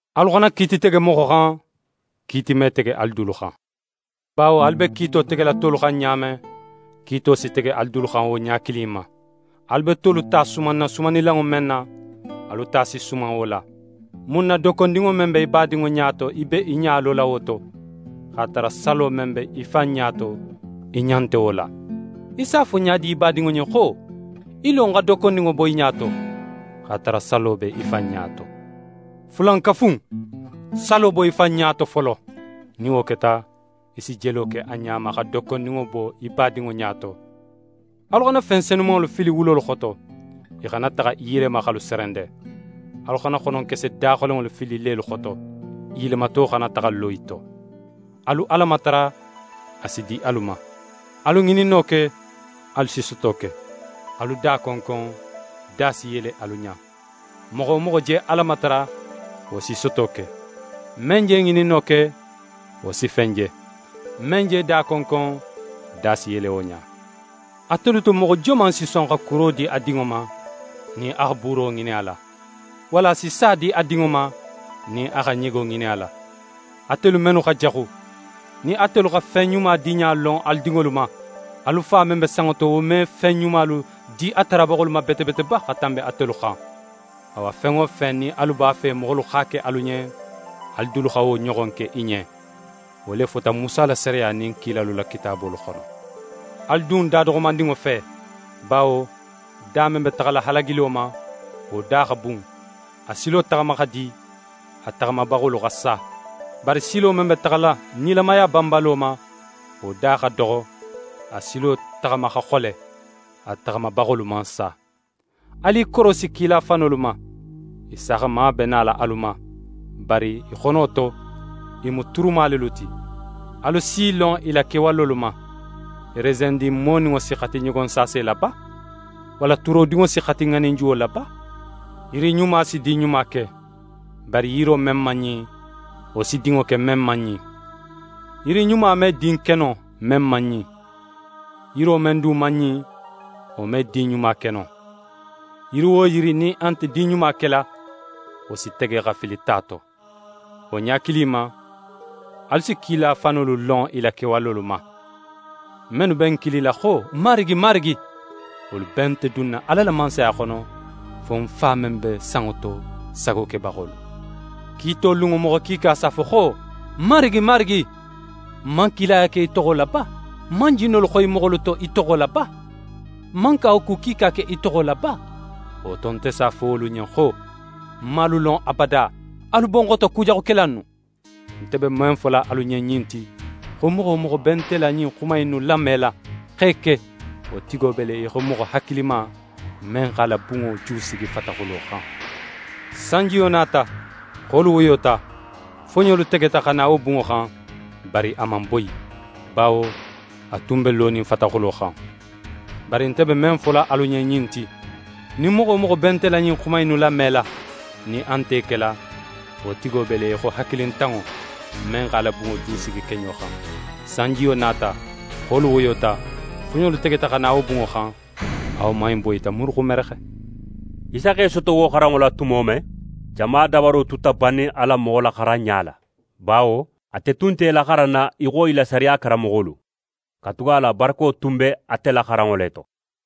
«Alu xana kiiti tege moxo xan, kiiti me tege alu dulu xan, bawo alu be kiito tegela tolu xan ɲa men, kiito si tege alu dulu xan wo ɲa kilin in ma. Alu be tolu ta sumanna sumannilanŋo men na, alu ta si suman wo la. Mun na dokkondinŋo men be í badinŋo ɲa to, í be í ɲa lola wo to, x'a tara salo men be í fan ɲa to, í ɲa nte wo la? Í s'a fo ɲa di í badinŋo ɲen xo: “Í lo, ń xa dokkondinŋo bo í ɲa to,” x'a tara salo be í fan ɲa to? Fulankafu in, salo bo í fan ɲa to folo; nin wo keta, í si jelo ke a ɲa ma, xa dokkondinŋo bo í badinŋo ɲa to. «Alu xana fen senumanŋolu fili wulolu xoto, i xana taxa i yelema x'alu serende. Alu xana xononkese daxolenŋolu fili lelu xoto, i yelemato xana taxa lo i to. «Alu Ala matara, a si di alu ma; alu ŋininno ke, alu si soto ke; alu da konkon, da si yele alu ɲa. Moxo wo moxo je Ala matara, wo si soto ke; men je ŋininno ke, wo si fen je; men je da konkon, da si yele wo ɲa. Atelu to, moxo joman si son xa kuro di a dinŋo ma, nin a xa buuro ŋinin a la? Walla a si sa di a dinŋo ma nin a xa ɲego ŋinin a la? Atelu mennu xa jaxu, nin atelu xa fen ɲuma diɲa lon alu dinŋolu ma, alu Fa men be sanŋo to, wo me fen ɲumalu di a tarabaxolu ma bete bete ba, xa tanbi atelu xan? «Awa, fen wo fen nin alu b'a fe moxolu x'a ke alu ɲen, alu dulu xa wo ɲoxon ke i ɲen. Wo le fota Musa la sariya nin kilalu la kitaabolu xono. «Alu dun da doxomandinŋo fe. Bawo da men be taxala halagilo ma, wo da xa bun, a silo taxama xa di, a taxamabaxolu xa sa. Bari silo men be taxala nilamaya banbalo ma, wo da xa doxo, a silo taxama xa xole, a taxamabaxolu man sa. «Alu i korosi kila fanolu ma. I saaxama be nala alu ma, bari i xono to, i mu turuma lelu ti. Alu s'i lon i la kewalolu ma. Resendin moninŋo si xati ɲogonsaase la ba? Walla turodinŋo si xati ŋaninjuwo la ba? Yiri ɲuma si din ɲuma ke, bari yiro men man ɲin, wo si dinŋo ke men man ɲin. Yiri ɲuma me din ke no, men man ɲin. Yiro men du man ɲin, wo me din ɲuma ke no. Yiri wo yiri nin a nte din ɲuma kela, wo si tege xa fili ta to. Wo ɲa kilin in ma, alu si kila fanolu lon i la kewalolu ma. «Mennu be ń kilila xo: “Marigi, Marigi”, wolu bee nte dunna Ala la Mansaya xono, fo ń Fa men be sanŋo to sago kebaxolu. Kiito lunŋo, moxo kiika s'a fo ń ɲen xo: “Marigi, Marigi”, n man kilaya ke í toxo la ba? N man jinnolu xoyi moxolu to í toxo la ba? N man kawaku kiika ke í toxo la ba? Wo to, nte s'a fo wolu ɲen xo: “Ń man alu lon abada. Alu bo ń xoto, kujaxukela innu.” «Nte be men fola alu ɲen ɲin ti, xo moxo wo moxo be nte la ɲin xuma innu lamela, x'e ke, wo tigo be le í xo moxo hakilima, men x'a la bunŋo jusigi fataxulo xan. Sanjiyo nata, xolu woyota, foɲolu tegeta xa na wo bunŋo xan, bari a man boyi; bawo a tun be lonin fataxulo xan. Bari nte be men fola alu ɲen ɲin ti, nin moxo wo moxo be nte la ɲin xuma innu lamela, nin a nte i kela, wo tigo be le í xo hakilintanŋo, men x'a la bunŋo jusigi keɲo xan. Sanjiyo nata, xolu woyota, foɲolu tegeta xa na wo bunŋo xan, a woman in boyita muruxumerexe.» Isa x'é soto wo xaranŋo la tumo men, jama dabaro tuta bannin a la moxolaxaranɲa la, bawo ate tun nte i laxaranna í xo i la sariya karanmoxolu; katugala barako tun be ate la xaranŋo le to.